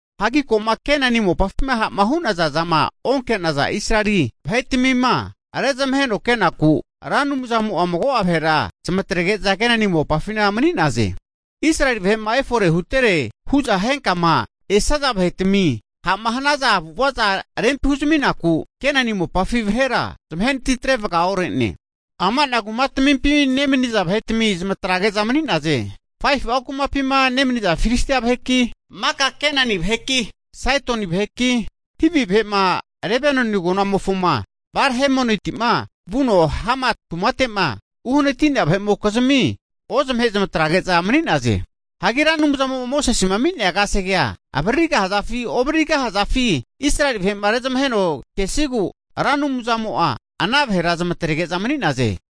Hagi ko'ma Kenani mopafima ha'ma hu'naza zama onke'naza Israeli vahetmima rezamaheno kenaku, Ra Anumzamo'a mago'a vahera zamatrege'za Kenani mopafina mani'naze. Hagi Israeli vahe'ma efore hutere hu'za henkama esaza vahetami Ra Anumzamo'a ha'ma hanaza avu'avaza rempi huzaminaku Kenani mopafi vahera zamahenatitre vagaore'ne. Ama'na kumatmimpi nemaniza vahetami zamatrege'za mani'naze. Faifu'a kumapima nemani'za Filistia vaheki, maka Kenani vaheki, Saidoni vaheki, Hivi vahe'ma Lebanoni agonamofoma Bal-Hermoniti'ma vuno Hamat kumate'ma uhanati'nea vahe'mokizmi ozamahe zamatrege'za mani'naze. Hagi Ra Anumzamo'ma Mosesema ami'nea kasegea avaririgahazafi ovaririgosazafi huno Israeli vahe'ma rezamaheno kesigu Ra Anumzamo'a ana vahera zamatrege'za mani'naze.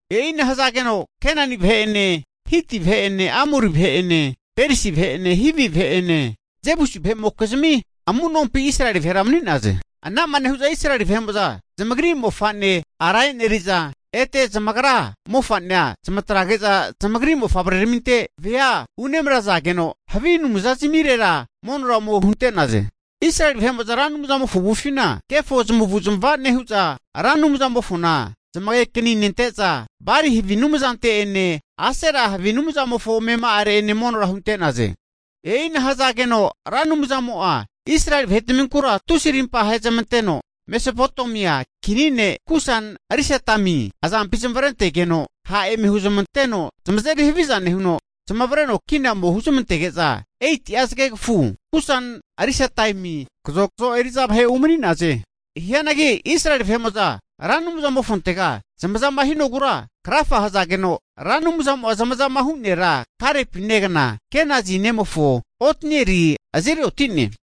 E'ina hazageno Kenani vahe'ene, Hiti vahe'ene, Amori vahe'ene, Perisi vahe'ene Hivi vahe'ene, Jebusi vahe'mokizmi amu'nompi Israeli vahera mani'naze. Ana'ma nehu'za Israeli vahe'mo'za zamagri mofa'ne ara e'neri'za, ete zamagra mofa'nea zamatrazage'za zamagri mofavreramintera vea omeneri'za unemrazageno, havi anumzazmirera monora ome hunte'naze. Israeli vahe'mo'za Ra Anumzamofo avufina kefo zamavu'zmava nehu'za, Ra Anumzamofona zamagekani nente'za, Bali havi anumzante'ene Asera havi anumzamofo amema'are monora hunte'naze. E'ina hazageno Ra Anumzamo'a Israeli vahe'tminkura tusi arimpa ahezamanteno Mesopotemia Kini ne' Kusan-risataimi azampi zamavarentegeno ha' eme huzamanteno zamazeri haviza nehuno, zamavareno kina ome huzmantege'za 8'a zagegafufi Kusan-risataimi kazokzo eri'za vahe umani'naze. Hianagi Israeli vahe'mo'za Ra Anumzamofontega zamazama hinogura krafa hazageno, Ra Anumzamo'a zamazama hu' nera, Kalepi negana Kenazi ne'mofo, Otnielina azeri oti'ne.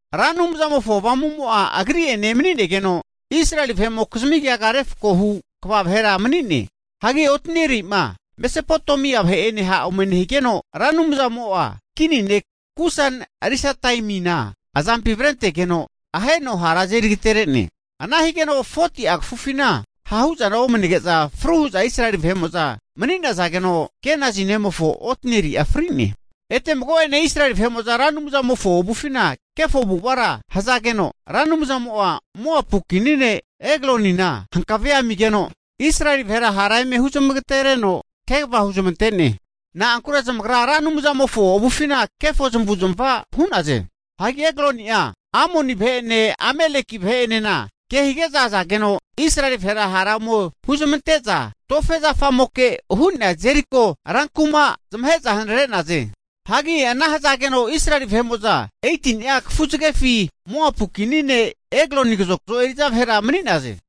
Ra Anumzamofo Avamumo'a agri'ene emani'negeno, Israeli vahe'mokizmi keaga refko hu kva vahera mani'ne. Hagi Otnieli'ma Mesopotemia vahe'ene ha' ome nehigeno, Ra Anumzamo'a kini ne' Kusan-risataimina azampi avrentegeno aheno hara azeri agatere'ne. Ana higeno 40'a kafufina ha'huzana omanege'za, fru hu'za Israeli vahe'mo'za mani'nazageno, Kenazi ne'mofo Otnieli'a fri'ne. Ete mago'ene Israeli vahe'mo'za Ra Anumzamofo avufina kefo avu'avara hazageno, Ra Anumzamo'a Moapu kini ne' Eklonina hankavea amigeno Israeli vahera hara eme huzmagatereno kegava huzmante'ne. Na'ankure zamagra Ra Anumzamofo avufina kefo zamavu'zamava hu'naze. Hagi Ekloni'a Amoni vahe'ene Ameleki vahe'enena kehige'za azageno Israeli vahera hara ome huzamante'za tofegna zafamoke hu'nea Jeriko rankuma zamahe'za hanare'naze. Hagi ana hazageno Israeli vahe'mo'za 18ni'a kafuzagefi Moapu kini ne' Ekloni kazokzo eri'za vahera mani'naze.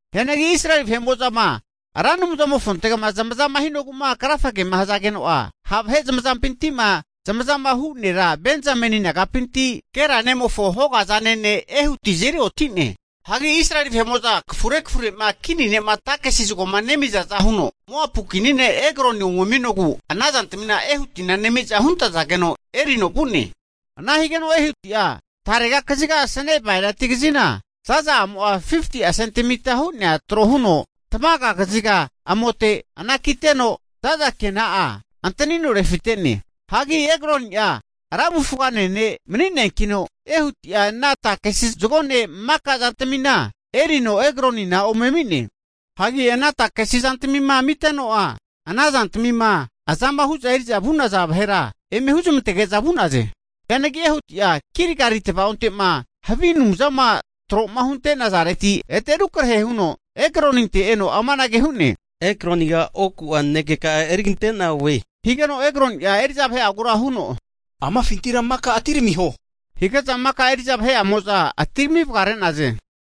Hianagi Israeli vahe'mo'zama Ra Anumzamofontegama zamaza hinogu'ma krafagema hazageno'a, ha' vahe zamazampinti'ma zamazama hu' nera Benzameni nagapinti Gera nemofo hoga azane ne' Ehuti azeri oti'ne. Hagi Israeli vahe'mo'za kafure kafure'ma kini ne'ma takesi zagoma nemizaza huno Moapu kini ne' Ekloni ome ami'nogu ana zantamina Ehutina nemi'za huntazageno erino vu'ne. Ana higeno Ehuti'a tarega kaziga asane bainati kazina zaza'amo'a 50'a sentemita hu'nea tro huno tamaga kaziga amote anakiteno za'za ke'na'a antanino refite'ne. Hagi Ekloni'a ra avufgane ne' mani'neankino, Ehuti'a ana takesi zagone maka zantamina erino Eglonina ome ami'ne. Hagi ana takesi zantamima amiteno'a, ana zantamima azama hu'za eri'za vu'naza vahera eme huzamantege'za vu'naze. Hianagi Ehuti'a Gilgali tavaonte'ma havi anumzama tro'ma hunte'nazareti ete rukrehe huno Ekloninte eno amanage hu'ne, Ekloniga oku'a nanekeka'a erigante'na oe, higeno Ekloni'a eri'za vahe'agura huno, amafintira maka atiramiho, hige'za maka eri'za vahe'amo'za atirami vagare'naze.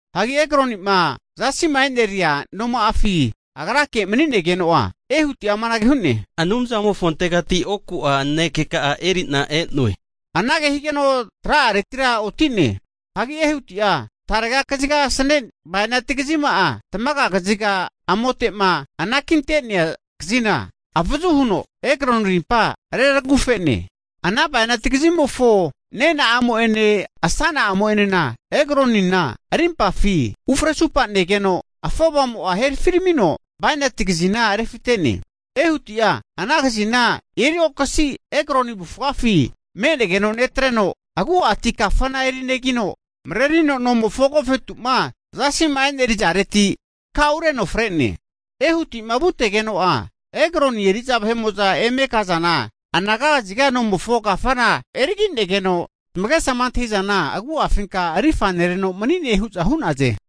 Hagi Eglonima zasi'ma e'neria noma'afi agrake'ma manigeno'a, Ehuti'a amanage hu'ne, Anumzamofontegati oku nanekeka'a eri'na e'noe. Anage higeno tra'aretira oti'ne. Hagi Ehuti'a tarega kazigama asane bainati kazima tamaga kaziga amote'ma anakinte'nea kazina avazu huno, Ekloni rimpa reragufe'ne. Ana bainati kazimofo nena'amo'ene asana'amo'enena Eglonina rimpafi ufresupanegeno afovamo'a herafiramino bainati kazina refite'ne. Ehuti'a ana kazina eriokasi Ekloni avufgafi me'negeno netreno, agu'ati kafana erinegino, marerino nomofo agofetu'ma zasi'ma e'nerizareti takaureno fre'ne. Ehuti'ma vutegeno'a, Ekloni eri'za vahe'mo'za eme kazana anaga kaziga nomofo kafana erigi'negeno, zamagesama antahi'zana agu'afinka rifa nereno mani'ne hu'za hu'naze.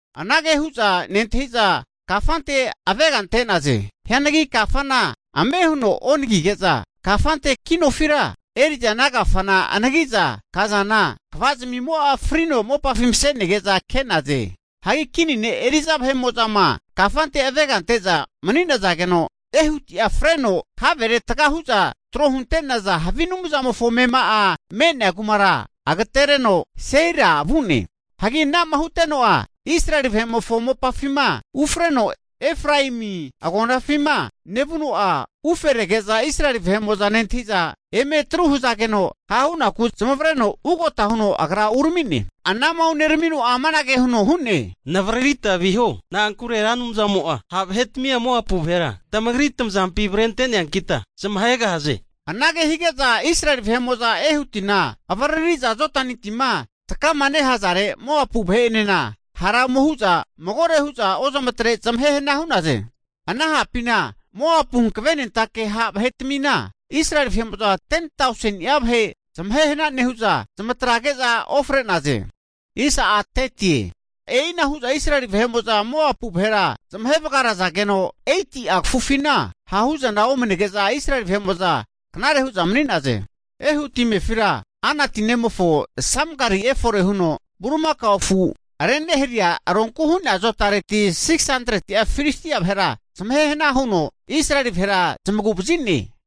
Anage hu'za nentahiza kafante avega ante'naze. Hianagi kafana ame huno onagige'za kafante kinofira eri'za ana kafana anagi'za kazana, kvazmimo'a frino mopafi mase'nege'za ke'naze. Hagi kini ne' eri'za vahe'mo'zama kafante avega ante'za mani'nazageno, Ehuti'a freno havere taga hu'za trohunte'naza havi anumzamofo amema'a me'nea kumara agatereno Seira vu'ne. Hagi ana'ma huteno'a Israeli vahe'mofo mopafima ufreno Efraemi agonafima nevuno'a, ufe rege'za Israeli vahe'mo'za nentahi'za eme atru hazageno, ha' hunaku zamavareno ugota huno agra urami'ne. Anama uneramino'a amanage huno hu'ne, navaririta viho, na'ankure Ra Anumzamo'a ha' vahetamia Moapu vahera tamagri tamazampi avrente'neankita zamahegahaze. Anage hige'za Israel vahe'mo'za Ehutina avariri'za Jodani tima takama nehazare Moapu vahe'enena hara ome hu'za magore hu'za ozamatre zamahehana hu'naze. Ana hapina Moapu hankavenentake ha' vahe'tmina Israeli vahe'mo'za 10tauseni'a vahe zamahehna nehu'za zamatrage'za ofre'naze. E'ina hu'za Israeli vahe'mo'za Moapu vahera, zamahe vagarazageno 80'a kafufina hahu'zana omanege'za, Israeli vahe'mo'za knare hu'za mani'naze. Ehuti amefira Anati nemofo Samgari efore huno bulimakao afu reneharia ronku hu'nea azotareti 600'a Filistia vahera zamahe hana huno Israeli vahera zamagu'vazi'ne.